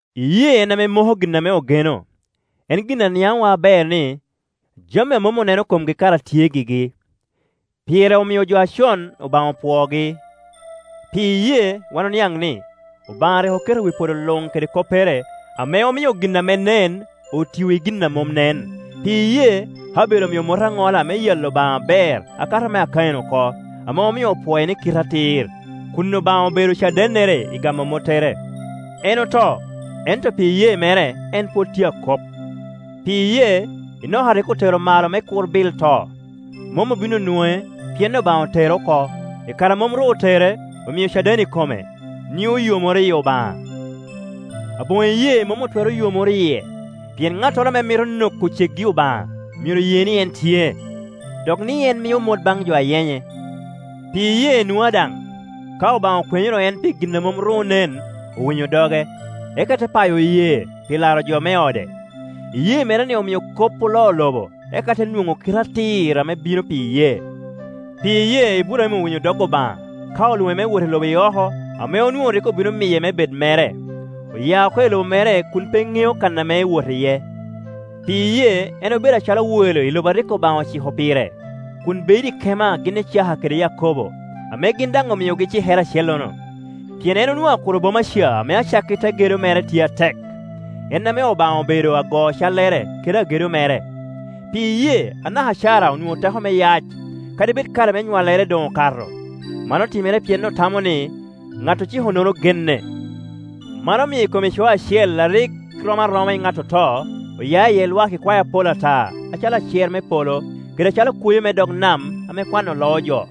Iyee en ame moko gin ame ogeno, en gin a niaŋowa aber ni, jami a mom oneno komgi kara tye gigi. Pire omio jo acon, Obaŋa opwoogi. Pi iyee wan oniaŋ ni, Obaŋa rik oketo wi podo luŋ kede koppere, ame omio gin ame nen otio i gin a mom nen. Pi iyee Abel omio mot aŋola me yalo Obaŋa aber akato mea Kain oko, ame omio opwoe ni kite atir, kun Obaŋa obedo cadennere i gamo mottere. En oto, ento pi iyee mere en pwod tye akop. Pi iyee Enoka rik otero malo me kur bil to. Mom obin onwoŋe, pien Obaŋa otere oko. I kare a mom ru otere, omio caden i kome, ni oyomoro yi Obaŋa. Aboŋo iyee mom otwero yomoro yie, pien ŋattoro ame mito noko ceggi Obaŋa myero ye ni en tye, dok ni en mio mot baŋ jo a yenye. Pi iyee Nua daŋ, ka Obaŋa okwenyoro en pi gin a mom ru onen, owinyo doge, eka te payo yee pi laro jo me ode. Iyee mere-ni omio kop oloo lobo eka te nwoŋo kite atir ame bino pi iyee. Pi iyee Iburaim owinyo dog Obaŋa ka olwoŋe me wot i lobo i oko ame onwoŋo rik obino miye me bed mere. Oya oko i lobo mere kun pe ŋeo kan ame ewoto iye. Pi iyee en obedo acalo welo i lobo a rik Obaŋa ociko pire, kun bedo i kema gin Icaka kede Yakobo, ame gin daŋ omiogi cikere acellono. Pien en onwoŋo akuro boma ca ame acakki te gedo mere tye atek, en ame Obaŋa obedo ago-callere kede agedo mere. Pi iyee anaka Cara onwoŋo teko me yac, kadi bed kare me nywallere doŋ okato. Man otimere pien otamo ni, ŋat ociko-nono genne. Man omio I kom ico acel a rik rom aroma i ŋat oto, oya iye lwak ikwae apol ata acalo acer me polo, kede acalo kwoyo me dog nam ame kwano loo jo.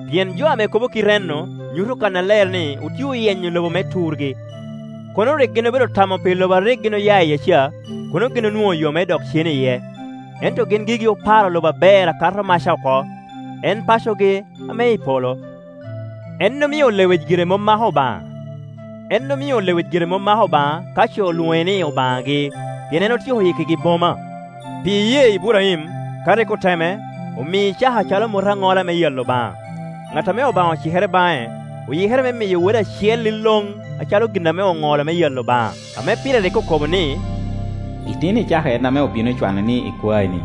Pien jo ame kobo kit enno nyuto kannaler ni otye oyenyo lobo me turgi. Kono rik gin obedo tamo pi lobo a rik gin oya iye ca, kono gin onwoŋo yo me dok cen iye. Ento gin gigi oparo loba aber akato maca oko, en pacogi ame i polo. En omio lewic gire mom mako Obaŋa ka ce olwoŋe ni Obaŋagi, pien en otyeko yikkigi boma. Pi iyee Iburaim, ka rik oteme, mio Icaka acalo mot aŋola me yalo Obaŋa; ŋat ame Obaŋa ocikere baŋe oyikere me miyo wode acel iloŋ acalo gin ame oŋolo me yalo Obaŋa, ame pire rik okobo ni, “Itino Icaka en ame obino cwano ni ikwaeni.”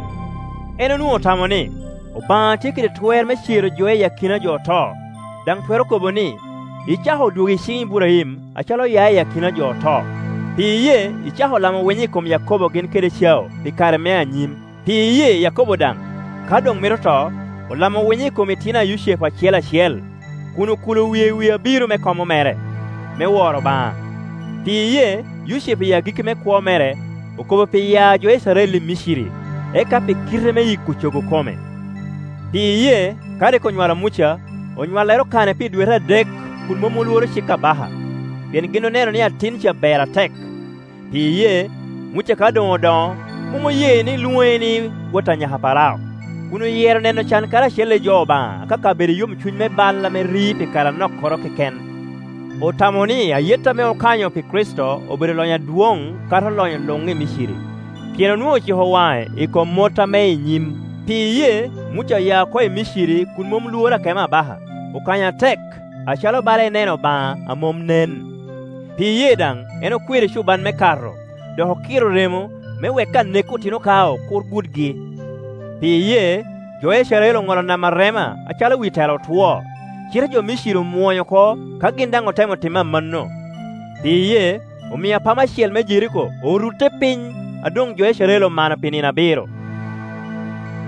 En onwoŋo otamo ni, Obaŋa tye kede twer me cero jo iyi akina jo oto; daŋ otwero kobo ni, Icaka odwogo i ciŋ Iburaim acalo oya i akina jo oto. Pi iyee Icaka olamo winyo i kom Yakobo gin kede Ecau pi kare me i nyim. Pi iyee Yakobo daŋ, ka doŋ mito to, olamo winyo i kom itino a Yucepu acel acel, kun okulo wie i wi abiro me komo mere, me woro Obaŋa. Pi iyee Yucepu, iyi agikki me kwo mere, okobo pi yaa a jo Icrael i Miciri, eka pi kite me yiko cogo kome. Pi iyee, ka rik onywalo Muca, onywallere okane pi dwete adek kun mom olworo cik abaka, pien gin oneno ni atin ca ber atek. Pi iyee Muca, ka doŋ odoŋo, mom oye ni lwoŋe ni wot a nyaka a Parao, kun oyero neno can karacel i jo Obaŋa akaka bedo i yomcuny me bal ame ri pi kare anokkoro keken. Otamo ni ayet ame okanyo pi Kricito obedo lonyo adwoŋ kato lonyo luŋ i Miciri, pien onwoŋo ociko waŋe i kom mot ame i nyim. Pi iyee Muca oya oko i Miciri kun mom lworo akemo abaka; okanyo atek, acalo bala eneno Obaŋa a mom nen. Pi iyee daŋ en okwero ecuban me Kato, dok okiro remo, me wek anek otino kao kur gudgi. Pi iyee jo Icrael oŋolo Nam Arema acalo wi tela otwo; cite jo Miciri omwony oko ka gin daŋ otemo timo amanno. Pi iyee omio apama cel me Jeriko orutte piny a doŋ jo Icrael omano pi nino abiro.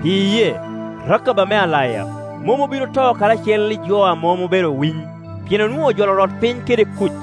Pi iyee Rakab ame alaya mom obin oto karacel i jo a mom obedo owiny, pien onwoŋo rik ojolo orotpiny kede kuc.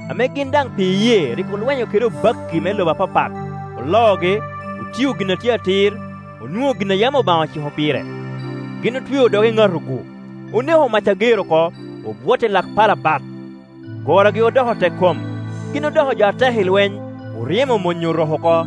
ame gin daŋ pi iyee rik olwenyo kede obakki me lobo apapat, oloogi, otio gin a tye atir, onwoŋo gin a yam Obaŋa ociko pire. Gin otweo dog eŋatogu, oneko mac ager oko, obwot i lak pala bat. Gorogi odoko tekkom, gin odoko jo atek i lweny, oryemo mony orok oko.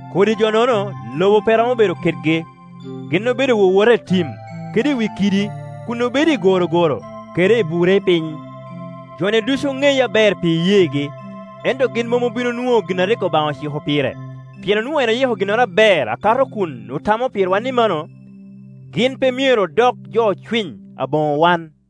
Kodi jo-nono lobo pe romo bedo kedgi. Gin obedo wowota i tim, kede i wi kiddi, kun obedo i gorogoro kede i bure piny. Jo-ni ducu oŋeye aber pi iyeegi, ento gin mom obin onwoŋo gin a rik Obaŋa ociko pire, pien onwoŋo en oyiko ginnoro aber akato kun otamo pirwa, ni mano, gin pe myero odok jo ocwiny aboŋo wan.